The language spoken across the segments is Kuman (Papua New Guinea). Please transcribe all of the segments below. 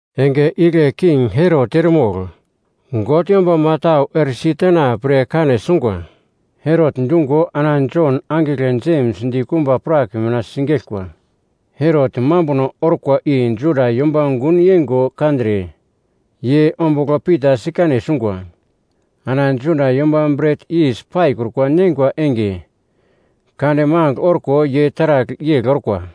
Enge igle King Herot eremogl God yombama tau eresi tena pre kane sungwa. Herot dungo ana Jon angigle Jems dikumba prak mina sigeglkwa. Herot mambuno orkwa i Juda yomba gun yeingo kandre, ye ombugl Pita sikane sungwa. Ana Juda yomba Bret Yis Paikrukwa Neingwa Enge Kande magl orko ye taragl yegl orkwa.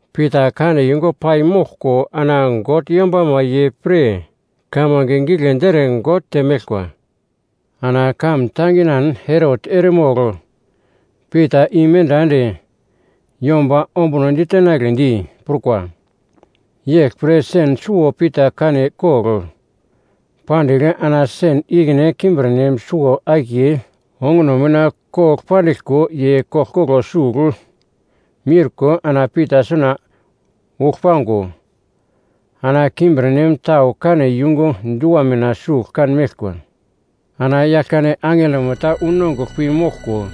Pita kane yungu pai moglko ana God yombama ye pre kamange giglendi ere God temeglkwa. Ana kamun tanginan Herot eremogl Pita imenda ende yomba ombuno ditenagledi prukwa. Yeglpre sen suwo Pita kane kogl pandigl ana sen ikine kimbirnem suwo-akiye onguno mina kogl pandiglko ye koglkoglo sugl miurko ana Pita suna uglpango, ana kimbirnem tau kane yungu dua mina sugl kan meglkwa. Ana Yaglkande angelomo ta unongugl pi moglko,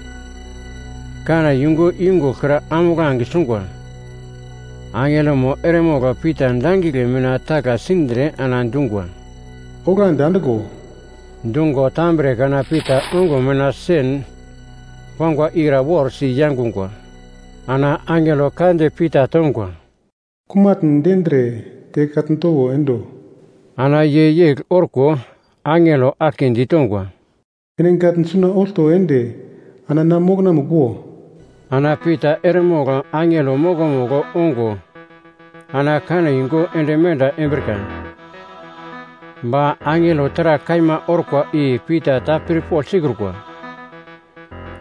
kane yungu yungugl kra ambuglange sungwa. Angelomo eremogl Pita dangigle mina tagla sindre ana dungwa, “Oglandi andiglo!” Dungo tambre kana Pita ongo mina sen pangwa ikra worsi yangungwa. Ana angelo ka di Pita tongwa, “Kumatn dendre, te katn towo endo!” Ana ye yegl orko, angelo aglke ditongwa, “Ene gatn suna olto ende ana na mokonamugl wo!” Ana Pita eremogl angelo mokomugl ongo ana kane yungu ende menda embrika, ba angelo taragl kaima orkwa i Pita ta pirpogl sikrukwa,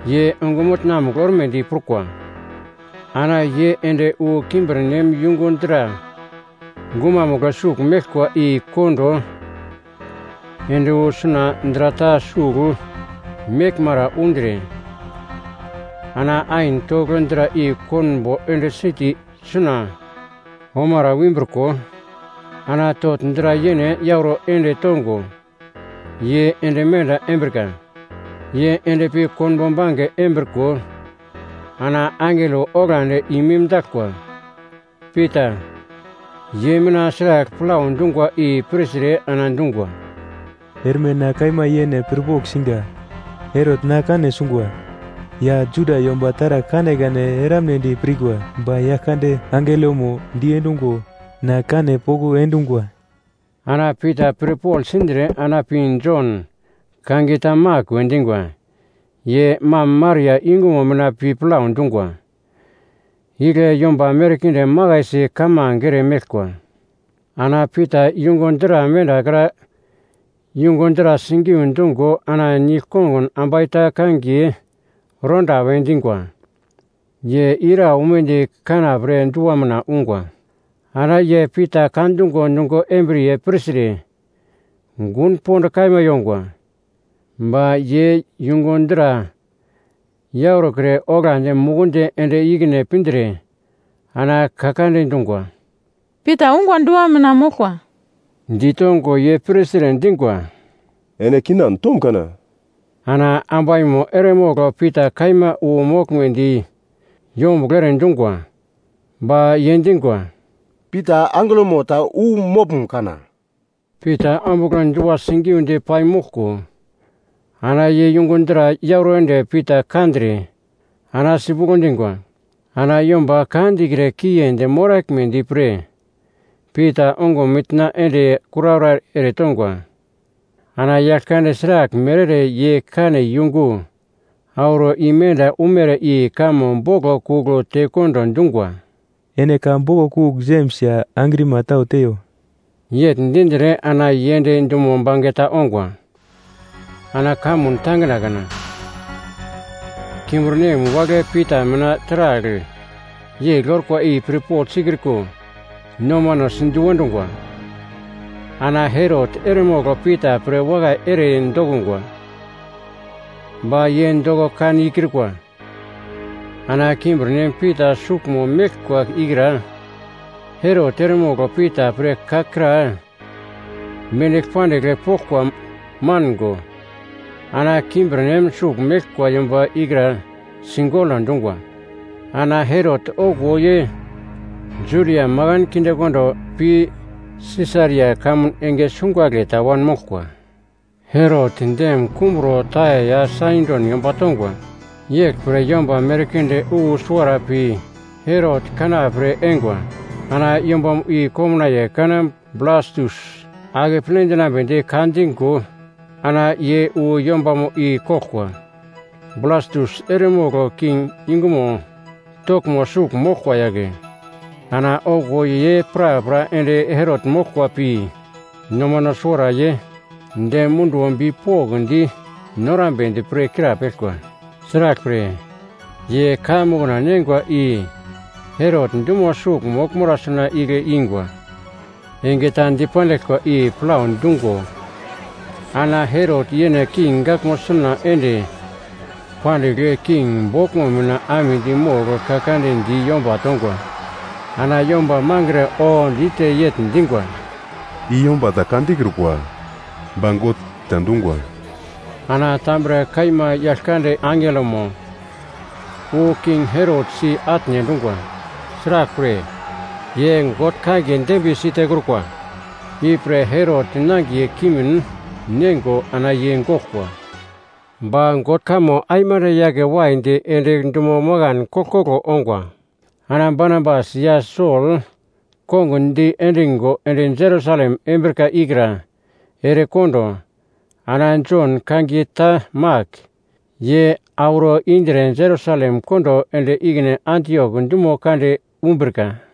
ye ongumutna-mugl ormedi prukwa. Ana ye ende wu kimbirnem yungu dra gumamugl sugl meglkwa i kondo ende wu suna dra ta sugl meglmara undre, ana ain togl dra i konbo ende siti suna omara wimbriko, ana togl dra yene yauro ende tongo, ye ende menda embrika. Ye endpi konbo bange embriko ana angelo oglandi i-mimdaglkwa. Pita, ye mina sragl plau dungwa i pirtre ana dungwa, “Erme na kaima yene pirpogl singa! Herot na kane sungwa, ya Juda yomba taragl kanekane eramnedi pirkwa, ba Yaglkande angelomo diendungo na kane poko endungwa.” Ana Pita pirpogl sindre ana pi Jon, kangiye ta Mak we dingwa, ye mam Maria yungumo mina pi plau dungwa. Igle yomba merkinde makaisi kamange ere meglkwa. Ana Pita yungu dra mendakra yungu dra sigiu dungo ana nigl-kongun ambai ta kangiye Roda we dingwa, ye ira umedi kanapre dua mina ungwa. Ana ye Pita ka dungo nungo embriye pirtre gun pond kaima yongwa, ba ye yungu dra yaurokre oglandi mukundi ende ikine pindre ana ka kande dungwa, “Pita ungwa dua mina moglkwa!” Ditongo ye pirtre dingwa, “Ene kinan tom kana!” Ana ambaimo eremogl Pita kaima wu moglmedi yombuglo ere dungwa. Ba ye dingwa, “Pita angelomo ta wu moglum kana?” Pita ombugl dua sigiudi pai moglko ana ye yungu dra yauro ende Pita kandre ana sipuglo dingwa. Ana yomba ka dikre kiendi moraglmedi pre Pita ongo mitna ende kuraura eretongwa. Ana Yaglkande sraglmere ere ye kane yungu auro imenda umere i kamo boglo kugl tekondo dungwa, “Ene ka boglo kugl Jems ya angrima tau teiyo.” Yegl dindre ana ye ende dumo bangeta ongwa. Ana kamun tangina kana, kimbirnem wagle Pita mina taragl yegl orkwa i pirpogl sikriko nomano sindu endongwa. Ana Herot eremogl Pita pre wakai ere dokungwa. Ba ye doko kan ikrukwa. Ana kimbirnem Pita suglmo meglkwa ikra Herot eremogl Pita pre ka kra mendigl pandigl poglkwa mango ana kimbirnem sugl meglkwa yomba ikra sigolo dungwa. Ana Herot okuwo ye Judia makan kindekondo pi Sisaria kamun enge sungagle ta wanmoglkwa. Herot dem kumburo Taia ya Saidon yomba tongwa. Yeglpre yomba merkinde wu suwara pi Herot kanapre eingwa. Ana yombamo i komnaiye kana Blastus akeple dinambedi ka dingo ana ye wu yombamo i koglkwa. Blastus eremogl king yungumo toglmo sugl moglkwa yagle. Ana okuwo ye prapra ende Herot moglkwa pi nomano suwara ye dem munduwo bipokndi norambedi pre krapeglkwa. Sraglpre, ye kaiya mokna neingwa i Herot dumo sugl moglmara suna igle ingwa. Enge ta dipandiglkwa i plau dungo ana Herot yene king gaglmo suna ende pandigl king boglmo mina amedi mogl ka kande di yomba tongwa. Ana yomba mangre oodite yegl dingwa, “I yomba ta ka dikrukwa, ba god ta dungwa!” Ana tambre kaima Yaglkande angelomo wu King Herot si-atne endungwa, sraglpre, ye God kangiye dembiye sitekrukwa. Ipre Herot nangiye kimin neingo ana ye goglkwa. Ba God kamo aimande yake waidi ende dumo makan koglkoglo ongwa. Ana Barnabas ya Sol kongun diendingo ende Jerusalem embrika ikra erekondo, ana Jon, kangiye ta Mak, ye auro indre Jerusalem kondo ende ikine Antiok dumo kande umbrika.